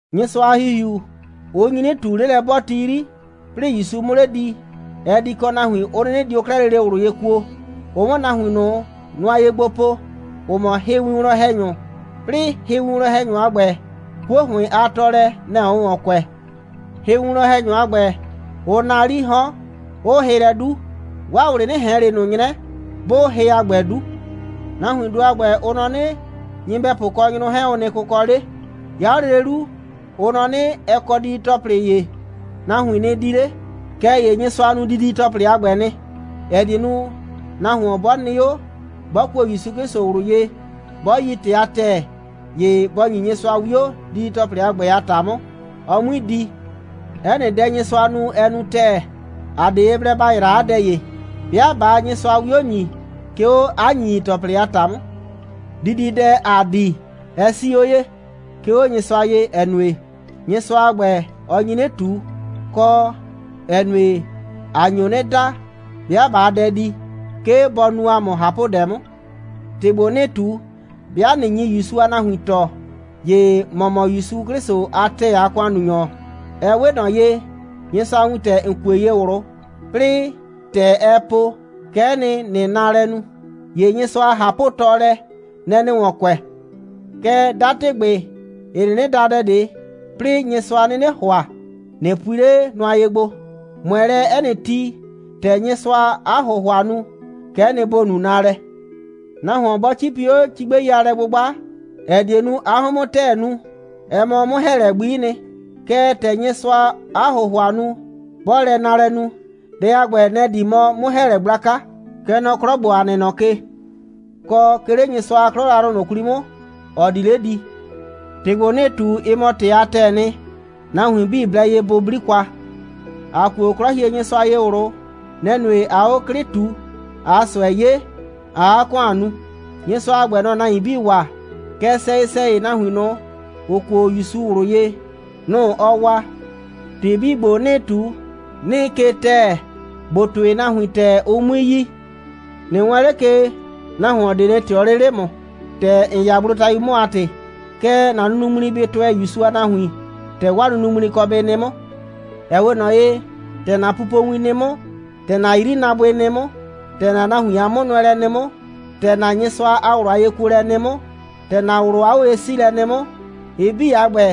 Nyɩsʋa a ‑Hihiu, ʋ nyi 'nɩ ꞊tu, 'lelɛ'bɔɔti 'yri, 'plɩɩ ‑Yusu 'mʋ 'le di, ɛ di kɔ nahuin, ‑ʋ 'nɩnɩ dio 'klɛɛ lele ꞊wlʋ ye kuo, ʋ 'mʋ nahuin ꞊nʋ nʋa ye gbo po, ‑ʋ mɔ hɩwinwlɔn‑hɛnyʋ, 'plɩɩ, hɩwinwlɔn‑hɛnyʋ a ‑gbɛ, 'kuo ‑hʋɩn a tɔɔlɛ, nɛ‑ ʋʋ ‑wɔn kʋɛ. Hɩwinwlɔn‑hɛnyʋ a ‑gbɛ, ʋʋ naa 'lii 'hɔn, 'ʋʋ hɩ lɛ 'du. 'Waa ꞊wlɩ 'nɩ ꞊hɛn ꞊le ꞊nʋ 'nyrɛ, 'bʋʋ hɩ a ‑gbɛ 'du. Nahuindʋ a ‑gbɛ, ʋ nɔ 'nɩ, nyɩbɛpʋ kɔ nyrʋ 'hɛɛn, ʋ nɩ kʋkɔ 'le. 'Ya 'o lele 'lu, ʋ nɔ 'nɩ, ɛ kɔ didi‑tɔplɩ ‑ye, nahuin nɩ di 'le. Kɛɛ ‑ye Nyɩsʋa nu didi‑tɔplɩ a ‑gbɛ nɩ, ‑ɛ die nu, nahuon 'bɔ nɩ 'o, 'bɔ kuo ‑Yusu 'Klɩsʋ ꞊wlʋ ye, 'bɔ yi ‑tɩ a ‑tɛɛ, ‑ye bɔ ‑nyi Nyɩsʋa 'wio, didi‑tɔplɩ a ‑gbɛ a ‑ta 'mʋ, ɔ 'mui di. 'Ɛ nɩ dɛ, Nyɩsʋa nu, ɛ nu ‑tɛɛ. ‑A 'de ye blɛ ‑ba yraa 'a dɛ ‑ye, 'bɩa ꞊baa Nyɩsʋa 'wio ‑nyi, 'ke 'o 'a ‑nyinyi‑tɔplɩ a ‑ta 'mʋ. Dididɛ, ‑aa di, ɛ 'sii 'o ye, 'ke 'o Nyɩsʋa ye, ‑ɛ nue, Nyɩsʋa a ‑gbɛ, ɔ nyi 'nɩ ꞊tu, kɔ, ‑ɛ nue, ‑a nyo 'nɩ da, 'bɩa ꞊baa dɛ di, 'ke bɔ nu ‑a mʋ ꞊hapʋdɛ 'mʋ. ‑Tɩ ‑gbo, 'nɩɩ ꞊tu, 'bɩa ꞊nɩ nyi ‑Yusu a nahuin tɔɔ, ‑ye ‑mɔ mɔ ‑Yusu 'Klɩsʋ a ‑tɛɛ a ‑kʋannunyɔ. Ɛ 'we ꞊nɔ ye, Nyɩsʋa a wintɛ, ‑n kue ye ꞊wlʋ, 'plɩɩ ‑tɛ ɛɛ po, kɛ'ɛ nɩ, ‑nɩɩ naalɛ nu. ‑Ye Nyɩsʋa a ꞊hapʋtɔɔlɛ, nɛ‑ ‑nɩɩ ‑wɔn kʋɛ. Kɛɛ, 'datɩgbɩ, ‑ɩ 'nɩnɩ da dɛ ꞊de, 'plɩɩ Nyɩsʋa 'nɩnɩ ‑hʋa, ꞊nɩ pui 'le nʋa ye gbo. ꞊Mʋɛ lɛ 'ɛ nɩ ti, ‑tɛ Nyɩsʋaa 'a ‑hʋhʋa nu, kɛ'ɛ nɩ, ‑bo nu naalɛ. Nahuon 'bɔ 'cipi 'o cigbɛi a lɛ'gbʋgba, ‑ɛ die nu, 'a 'hʋɩn 'mʋ ‑tɛɛ nu, ɛ mɔ 'mʋ‑hɛɛlɛ gbi'i nɩ. Kɛɛ, ‑tɛ Nyɩsʋaa 'a ‑hʋhʋa nu, 'bɔɔ lɛ naalɛ nu, dɛ a ‑gbɛ, nɛ‑ mɔ 'mʋ‑hɛɛlɛ gblaka, kɛ nɔ 'klɔ ‑gbo, ‑a nɩ nɔ ke, kɔ 'ke 'le Nyɩsʋa a 'klɔ yrayrʋ ꞊nʋ 'kwli 'mʋ, ‑ɔ di 'le di. ‑Tɩ ‑gbo, 'nɩɩ ꞊tu, ɩ mɔ ‑tɩ a ‑tɛɛ nɩ. Nahuin 'bii blɛ ye bʋ 'bli kwa. ‑A kuo 'Klɔhienyɩsʋa ye ꞊wlʋ. Nɛ‑ nue, ꞊aa 'o 'klɩ ꞊tu, ꞊aa ꞊sʋɛ 'ye, ꞊aa 'a ‑kʋan nu. Nyɩsʋa a ‑gbɛ, nɔ‑ɔ nahuin 'bii waa, kɛɛ, sɛyɩ‑sɛyɩ, nahuin ꞊nʋ, ‑ʋ kuo ‑Yusu ꞊wlʋ ye, nʋ‑ ɔɔ waa. ‑Tɩ 'bii ‑gbo, 'nɩɩ ꞊tu, 'nɩɩ ke ‑tɛɛ, ‑bo tʋɩ nahuin ‑tɛɛ, ʋ 'mui yi. ꞊Nɩ wɛɛn 'le ke, nahuon ꞊de nɩ ꞊tɩɔ 'le 'le ‑mʋ, ‑tɛ ‑n 'ya gblotayu 'mʋ a ‑tɩ. Kɛɛ, ‑na nunuŋmli bɩ tʋɛ ‑Yusu a nahuin, ‑tɛ 'waa nunuŋmli kɔ bɩ nɩ 'mʋ. Ɛ 'we ꞊nɔ ye, ‑tɛ ‑na pupowin nɩ 'mʋ, ‑tɛ ‑na 'yrinaabʋɩ nɩ 'mʋ, ‑tɛ ‑na nahuin a 'mʋnʋɛlɛ nɩ 'mʋ, ‑tɛ ‑na Nyɩsʋa a ꞊wlʋ a yekuolɛ nɩ 'mʋ, ‑tɛ ‑na ꞊wlʋ a 'oye'siilɛ nɩ 'mʋ, ɩ 'bii a ‑gbɛ,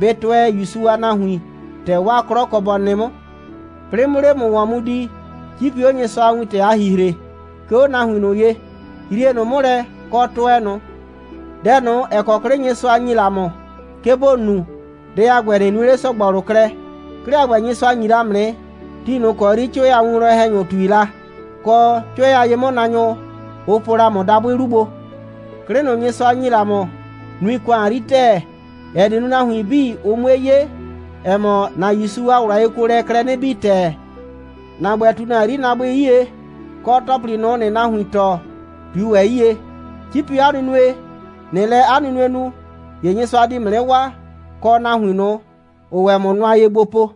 bɩ tʋɛ ‑Yusu a nahuin, ‑tɛ 'waa 'klɔ kɔ bɔ nɩ 'mʋ. 'Plɩɩ 'mʋ 'le ‑mʋ ‑wɔn di, 'cipi 'o Nyɩsʋa a wintɛ a ‑hihre, 'ke 'o nahuin ye. Yrie ꞊nʋ 'mʋ lɛ, kɔ, tʋɛ ꞊nʋ. Dɛ ꞊nʋ, ‑ɛ kɔ 'klɩ Nyɩsʋa ‑nyi la ‑mʋ, 'ke ‑bo nu, dɛ a ‑gbɛ, ꞊nɩ nue 'le ‑sɔgbɔlʋ klɛ. 'Klɩ a ‑gbɛ, Nyɩsʋa ‑nyi la ‑mʋ nɩ, ti ꞊nʋ ‑kɔ 'yri 'cʋɛ a winwlɔn‑hɛnyʋ ꞊tui la, kɔ, 'cʋɛ a ye'mʋnaanyʋ, ʋ po la ‑mʋ dabʋɩ 'lu gbo. 'Klɩ ꞊nʋ, Nyɩsʋa ‑nyi la ‑mʋ, nui ‑kʋan 'yri ‑tɛɛ, ‑ɛ die nu, nahuin 'bii, ʋ 'mue 'ye, ‑ɛ mɔ, ‑na ‑Yusu a ꞊wlʋ a yekuolɛɛ klɛ 'nɩ bii ‑tɛɛ. ‑Na ‑gbɛ, ꞊tu ‑na 'yrinaabʋɩ 'yie, kɔ, ‑tɔplɩ ꞊nʋ, ‑nɩɩ nahuin tɔɔ, ꞊tui ‑wɛ 'yie. 'Cipi 'o 'a nunue. ꞊Nɩɩ lɛ 'a nunue nu, ‑ye Nyɩsʋa di ‑mʋ 'nɩ waa, kɔ nahuin ꞊nʋ, ‑ʋʋ ‑wɛ ‑mʋ nʋa ye gbo po.